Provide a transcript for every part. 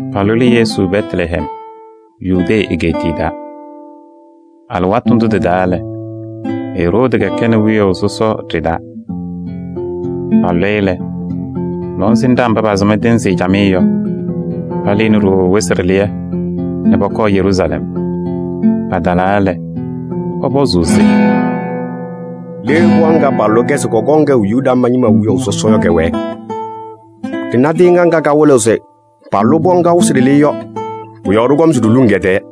Palʋlɩ Yesu Bɛtlɛhɛm Yudee egeetiye taa. Alɩwaatʋ ndʋ lɛ, Eroodi kɛkɛnɩ wiyaʋ sɔsɔ ɖɩ-taa. Palʋlɩ-ɩ lɛ, lɔŋsɩnɖaa mba pasɩm tɩɩnzɩ camɩyɛ yɔ, palɩnɩ ɖooo wɩsɩ ɖɩlɩyɛ nɛ pɔkɔɔ Yeruusalɛm. Patalaa lɛ, pɔpɔzʋʋ se: “Le pɩɣa ŋga palʋlɩ-kɛ se kɔkɔŋ kɛʋ Yuda ñɩma wiyaʋ sɔsɔ yɔ kɛwɛɛ? Ɖɩna tɩɩŋa ŋga kawɩlɩɣ se palʋlɩ pɩɣa ŋga yɔ wɩsɩ ɖɩlɩyɛ. Pʋ-yɔɔ ɖɩkɔm se ɖiluŋ kɛ-tɛɛ.”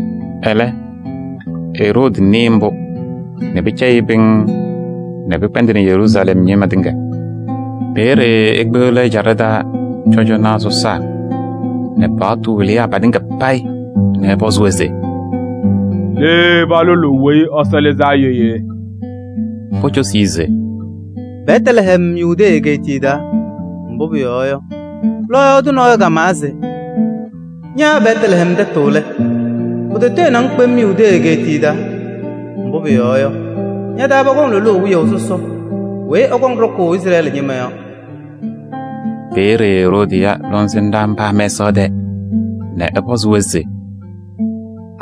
Ɛlɛ, Eroodi nɩɩ mbʋ nɛ pɩcɛyɩ-ɩ pɩŋŋ nɛ pɩkpɛndɩnɩ Yeruusalɛm ñɩma tɩŋa. Peeye ekpeɣli ɛ-ɛjaɖɛ taa cɔjɔnaa sɔsaa nɛ paɣtʋ wɩlɩyaa patɩŋa payɩ nɛ ɛpɔzʋʋ-wɛ se: “Le palʋlʋʋ Weyi Ɛsɔ Lɩzaa Yɔ yee?” Pocosi-i se: “Bɛtlɛhɛm, Yudee egeetiye taa. Mbʋ pʋyɔɔ yɔ, lɔɔyaɣ tʋ nɔɔyʋ kamawa se: ‘Ña Bɛtlɛhɛm tɛtʋ lɛ! Pʋtɔtɔyɩnɩ-ŋ kpem Yudee egeetiye taa. Mbʋ pʋyɔɔ yɔ, ña-taa pɔkɔŋ lʋlʋʋ wiyaʋ sɔsɔ weyi ɛkɔŋ ɖɔkʋʋ Izrɛɛlɩ ñɩma yɔ.’” Peeye Eroodi ya lɔŋsɩnɖaa mba mɛsaɣ tɛɛ nɛ ɛpɔzɩ-wɛ se: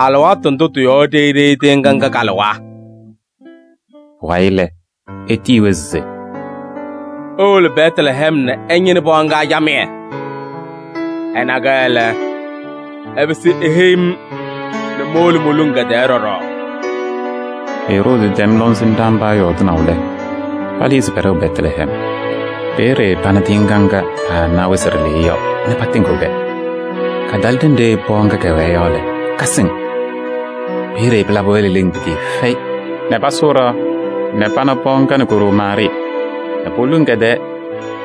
“Alɩwaatʋ ndʋ tɩ-yɔɔ ɖeyi ɖeyi tɩɩŋa ŋga kalɩwa?” Pʋwayɩ lɛ, etiyi-wɛ se: “Iwolo Bɛtlɛhɛm nɛ ɩñɩnɩ pɩɣa ŋga camɩyɛ. Ɩna-kɛ lɛ, ɩpɩsɩ iheyi-m nɛ mowolo moluŋ kɛ-tɛɛ ɖɔɖɔ.” Eroodi tɛm lɔŋsɩnɖaa mba yɔɔdɩnaʋ lɛ, palɩɩ se pɛɖɛɣ Bɛtlɛhɛm. Peeye pana tɩɩŋa ŋga paana wɩsɩ ɖɩlɩyɛ yɔ nɛ patɩŋɩɣ-kɛ. Katalɩ ɖenɖe pɩɣa ŋga kɛwɛɛ yɔ lɛ, kasɩŋ. Peeye pɩlabɩ-wɛ leleŋ pɩtɩɩfɛyɩ nɛ pasʋʋ ɖɩɣa nɛ pana pɩɣa ŋga nɛ ko-ɖoo Maarɩɩ nɛ poluŋ kɛ-tɛɛ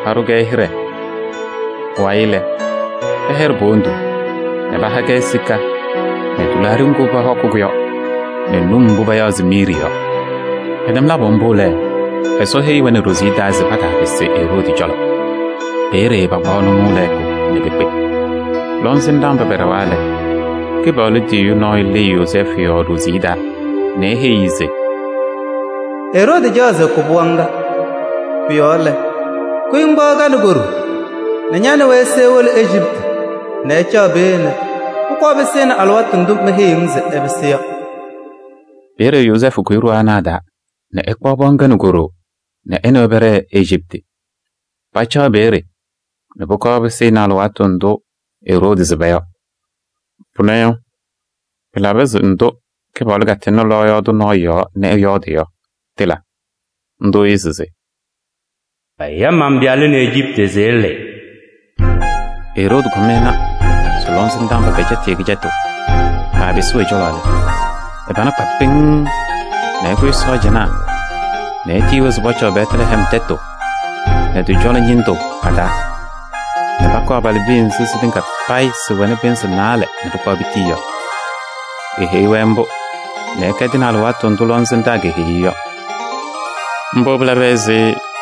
paɖʋ-kɛ hɩɖɛ. Pʋwayɩ lɛ, pɛyɛɖɩ po-wondu nɛ paha-kɛ sika nɛ tɩlaaɖɩ ŋgʋ pɔhɔkɩ yɔ nɛ num mbʋ payaɣ se miiri yɔ. Pɛtɛm labʋ mbʋ lɛ, Ɛsɔ heyi-wɛ nɛ ɖoziye taa se pataapɩsɩ Eroodi cɔlɔ. Peeye pakpaɣ nʋmɔʋ lɛɛkʋ nɛ pekpe. Lɔŋsɩnɖaa mba pɛɖɛwa lɛ, Kɩpaɣlʋ tiyiyu nɔɔyʋ lɩɩ Yozɛɛfʋ yɔɔ ɖoziye taa nɛ eheyi-i se: “Eroodi caɣ se ɛkʋ pɩɣa ŋga. Pʋ-yɔɔ lɛ, kʋyɩ ŋkpaɣ ka nɛ ko-ɖoo nɛ ña nɛ wɛ ise iwolo Ejiptɩ nɛ ɩcaɣ peeye nɛ pʋkɔɔ pɩsɩnɩ alɩwaatʋ ndʋ meheyiɣ-ŋ se ɩpɩsɩ yɔ.” Peeye Yozɛɛfʋ kʋyɩ ɖoo ana a-taa nɛ ɛkpaɣ pɩɣa ŋga nɛ ko-ɖoo nɛ ɛ nɛ wɛ pɛɖɛɛ Ejiptɩ. Pacaɣ peeye nɛ pʋkɔɔ pɩsɩnɩ alɩwaatʋ ndʋ Eroodi sɩba yɔ. Pʋnɛ yɔ, pɩlaba se ndʋ Kɩpaɣlʋ katɩŋnɩ lɔɔyaɣ tʋ nɔɔyʋ yɔɔ nɛ ɛyɔɔdɩ yɔ, tɩla. Ndʋ lɛ se: “Maya man-pɩyalʋ nɛ Ejiptɩ se ɛlɩɩ.” Eroodi kɔm ɛna se lɔŋsɩnɖaa mba pɛcɛtɩ-ɩ kɩcɛtʋ, paapɩsɩɣ ɛ-cɔlɔ lɛ, ɛ-pana kpa pɩŋŋ nɛ ɛkʋsɩ sɔɔjanaa nɛ etiyi-wɛ se pɔcɔɔ Bɛtlɛhɛm tɛtʋ nɛ tɩ-cɔlɔ ñɩndʋ pa-taa nɛ pakʋ abalɩbiya nzɩ sɩtɩŋa payɩ sɩwɛnɩ pɩnzɩ naalɛ nɛ pɩkpaɣ pitii yɔ. Eheyi-wɛ mbʋ nɛ ɛkɛdɩnɩ alɩwaatʋ ndʋ lɔŋsɩnɖaa keheyi-i yɔ. Mbʋ pɩlaba ɛzɩ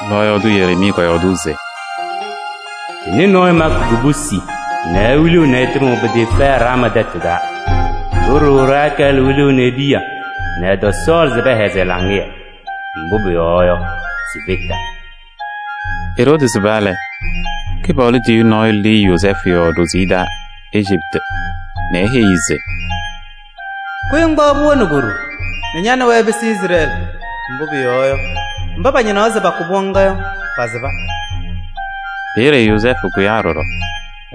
lɔɔyaɣ tʋ Yereemii kɔyɔɔdʋʋ se: “Ɖɩnɩ nɔɔyʋ makɩ kubusi nɛ ewiliɣ nɛ ɛtɩmɩɣ pɩtɩɩfɛyɩ Raamaa tɛtʋ taa. Ɖo-ɖoo Rakɛɛlɩ wiɣni e-piya nɛ ɛtɔsɔɔlɩ se pɛhɛzɩ ɛ-laŋɩyɛ. Mbʋ pʋyɔɔ yɔ, sifetaa.” Eroodi sɩba lɛ, Kɩpaɣlʋ tiyiyu nɔɔyʋ lɩɩ Yozɛɛfʋ yɔɔ ɖoziye taa Ejiptɩ nɛ eheyi-i se: “Kʋyɩ ŋkpaɣ pɩɣa nɛ ko-ɖoo nɛ ña nɛ wɛ ɩpɩsɩ Izrɛɛlɩ. Mbʋ pʋyɔɔ yɔ, mba pañɩnaɣ se pakʋ pɩɣa ŋga yɔ, pasɩba.” Peeye Yozɛɛfʋ kʋyaa ɖɔɖɔ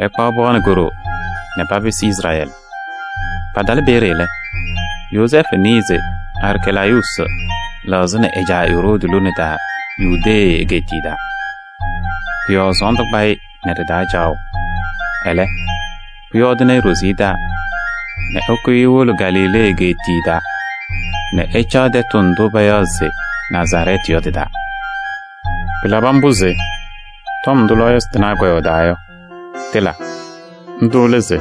ɛkpaɣ pɩɣa nɛ ko-ɖoo nɛ papɩsɩ Izrɛɛlɩ. Patalɩ peeye lɛ, Yozɛɛfʋ nɩɩ se Arcɛlaayuusi lɛɣzɩnɩ ɛ-caa Eroodi lone taa Yudee egeetiye taa. Pʋ-yɔɔ sɔɔndʋ kpa-ɩ nɛ ɖɩ-taa caɣʋ. Ɛlɛ, pʋyɔɔdɩnɩ-ɩ ɖoziye taa nɛ ɛkʋyɩ ewolo Galilee egeetiye taa nɛ ɛcaɣ tɛtʋ ndʋ payaɣ se Nazarɛɛtɩ yɔ tɩ-taa. Pɩlabɩ mbʋ se tɔm ndʋ lɔɔyɩsɩ tɩnaa kɔyɔɔdaa yɔ, tɩla. Ndʋ lɛ se: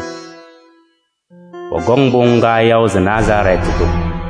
“Pɔkɔŋ pɩɣa ŋga yaʋ se Nazarɛɛtɩ tʋ.”